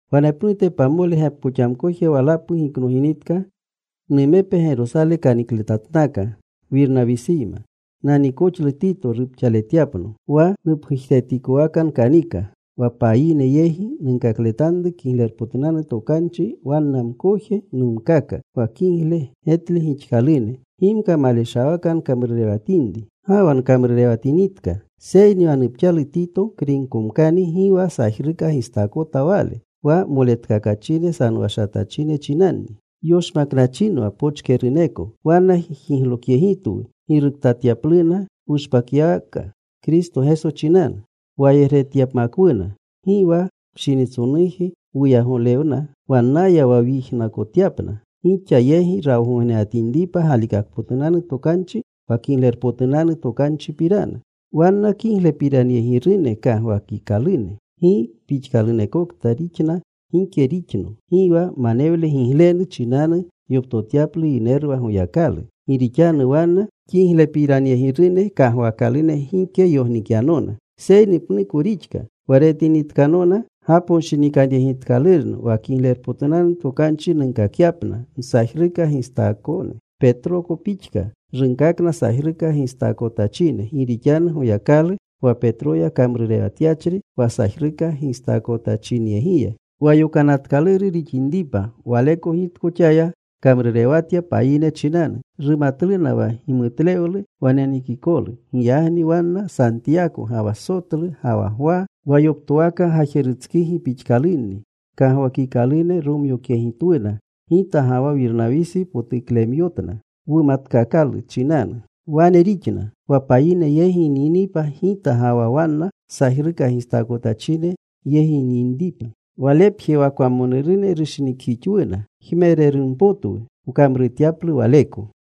Wanepnute, pamole gepkoxamkoje walapu giknoginitka, numepe Gerosale kanikletatnaka Wirnawisiyma. Naniikoxlu Tito rupxaletyapno. Wa nupgujetikowaka nkanika, wa payine yegi nunkakletanru Kiglerpotunanu Tokanchi, wanna mkoje nunkaka wa kigle getle gixkalune, gimka maleshawaka nkamrurewatinri ga wa nkamrurewatinitka. Seyni wa nupxalu Tito, Kriykomkani gi wa sajruka gistaakota wale. Wa moletkakachine sanowashatachine chinanni yoshmaknachinwa pochkeruneko. Wanna jiglokyegitwu giruktatyapluna wushpakyawaka Kristo Geso chinanu, wayegretyapmakwuna. Gi wa pshinitsonuji wuyagolewna wannaya wa wyijnakotyapna, gixa yegi rawgognenatinripa galikakpotunanu tokanchi wa Kiglerpotunanu Tokanchipirana. Wanna kiglepiranyegirune kagwaakalune, gi pixkalunekokta rixna gike rixno (Gi wa manewle giglenu chinanu yoptotyaplu yineru wa Goyakalu), gi rixanu wanna kiglepiranyegirune kagwaakalune gike yognikyanona. Seyni pnuko rixka. Wa retinitkanona gaponshinikanyegitkalurno wa Kiglerpotunanu Tokanchi nunkakyapna msajruka gistaakotkone, Petroko pixka runkakna sajruka gistaakotachine. Gi rixanu Goyakalu wa Petroya kamrurewatyachri wa sajruka gistaakotachinyegiya wa yokanatkaluru rixinripa, Waleko gitkoxaya kamrurewatya payine chinanu. Rumatluna wa gimutlewlu wa nenekikolu. Giyagni wanna Santiyako ga wa Sotlu ga wa Gwa, wa yoptowaka gajerustsigi pixkalunni kagwakikalune, romyokyegitwuna gita ga wa Wirnawisi potuklemyotna, wumatkaakalu chinanu. Wane rixna, wa payine yegi nyinipa gita, ga wa wanna sajruka gistaakotachine yegi yinripna. Walepje wa kwamonurune rushinikjixwuna. Jmererunpotwu wkamrutyaplu waleko.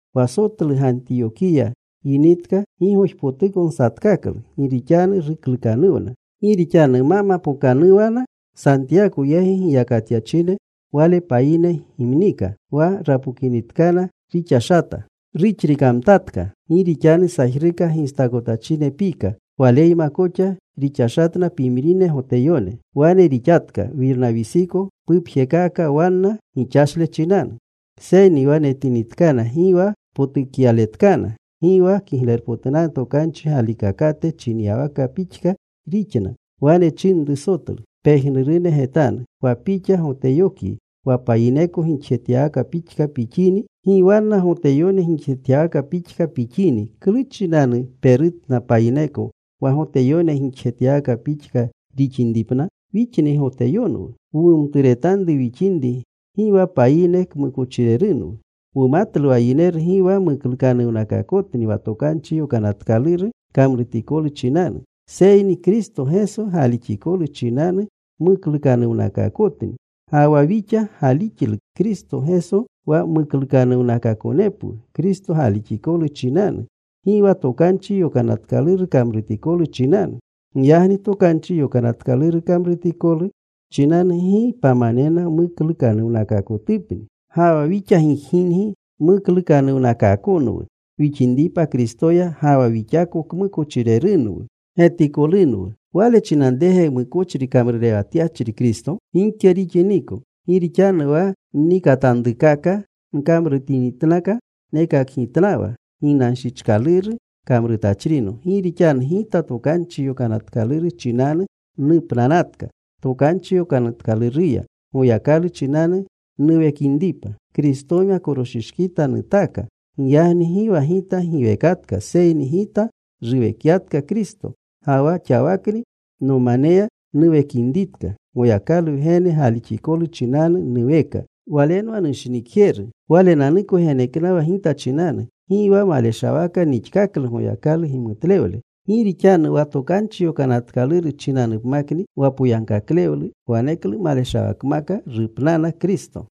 Wa Sotlu Gantiyokiya yinitka gigojipotuko nsatkaklu gi rixanu ruklukanuwna. Gi rixanu ma mapookanuwana Santiyako yegi giyakatyachine, wale payine gimnika. Wa rapokinitkana rixashata. Ruxrikamtatka. Gi rixanu sajruka gistaakotachine pika. Waleyma koxa rixashatna pimrine Goteyone. Wane rixatka Wirnawisiko pupjekaaka wanna gixashle chinanu. Seyni wa netinitkana gi wa potukyaletkana; gi wa Kiglerpotunanu Tokanchi galikakate chinyawaka pixka rixna, wane nchinru Sotlu pejnurune getanu, “Wa pixa Goteyokyi wa payineko gixjetyawaka pixka pixini; gi wanna Goteyone gixjetyawaka pixka pixini, ¿klu chinanu perutna payineko wa Goteyone gixjetyawaka pixka rixinripna? “Wixni wa Goteyonwu wumumturetanru wixinri, gi wa payine kmukochirerunwu. Wumatlu wa yineru gi wa muklukanuwnakaakotni wa Tokanchi Yokanatkaluru kamrutikolu chinanu, seyni Kristo Geso galixikolu chinanu muklukanuwnakaakotni. Ga wa wixa galixlu Kristo Geso wa muklukanuwnakaakonepwu Kristo galixikolu chinanu, gi wa Tokanchi Yokanatkaluru kamrutikolu chinanu. Giyagni Tokanchi Yokanatkaluru kamrutikolu chinanu gi pamanena muklukanuwnakaakotupni. “Ga wa wixa gijginri muklukanuwnakaakonwu wixinripa Kristoya, ga wa wixako kmukochirerunwu getikolunwu, ¿wale chinanrege mukochri kamrurewatyachri Kristo? Gike rixiniko. Gi rixanu wa nnikatanrukaka nkamrutinitnaka, nekakgitnawa ginanshichkaluru kamrutachrino. Gi rixanu gita Tokanchi Yokanatkaluru chinanu nupnanatka Tokanchi Yokanatkaluruya, Goyakalu chinanu nuwekinripa. Kristoyma koroshishkita nutaaka. Giyagni gi wa gita giwekatka, seyni gita ruwekyatka Kristo. Ga wa xawakni nomaneya nuwekinritka, Goyakalu Wgene galixikolu chinanu nuweka. Walenwa nushinikjeru. Walenanuko geneknawa gita chinanu. Gi wa maleshawaka nixkaklu Goyakalu gimutlewle. Gi rixanu wa Tokanchi Yokanatkaluru chinanupmakni wa poyagkaklewlu, waneklu maleshawakmaka rupnana Kristo.”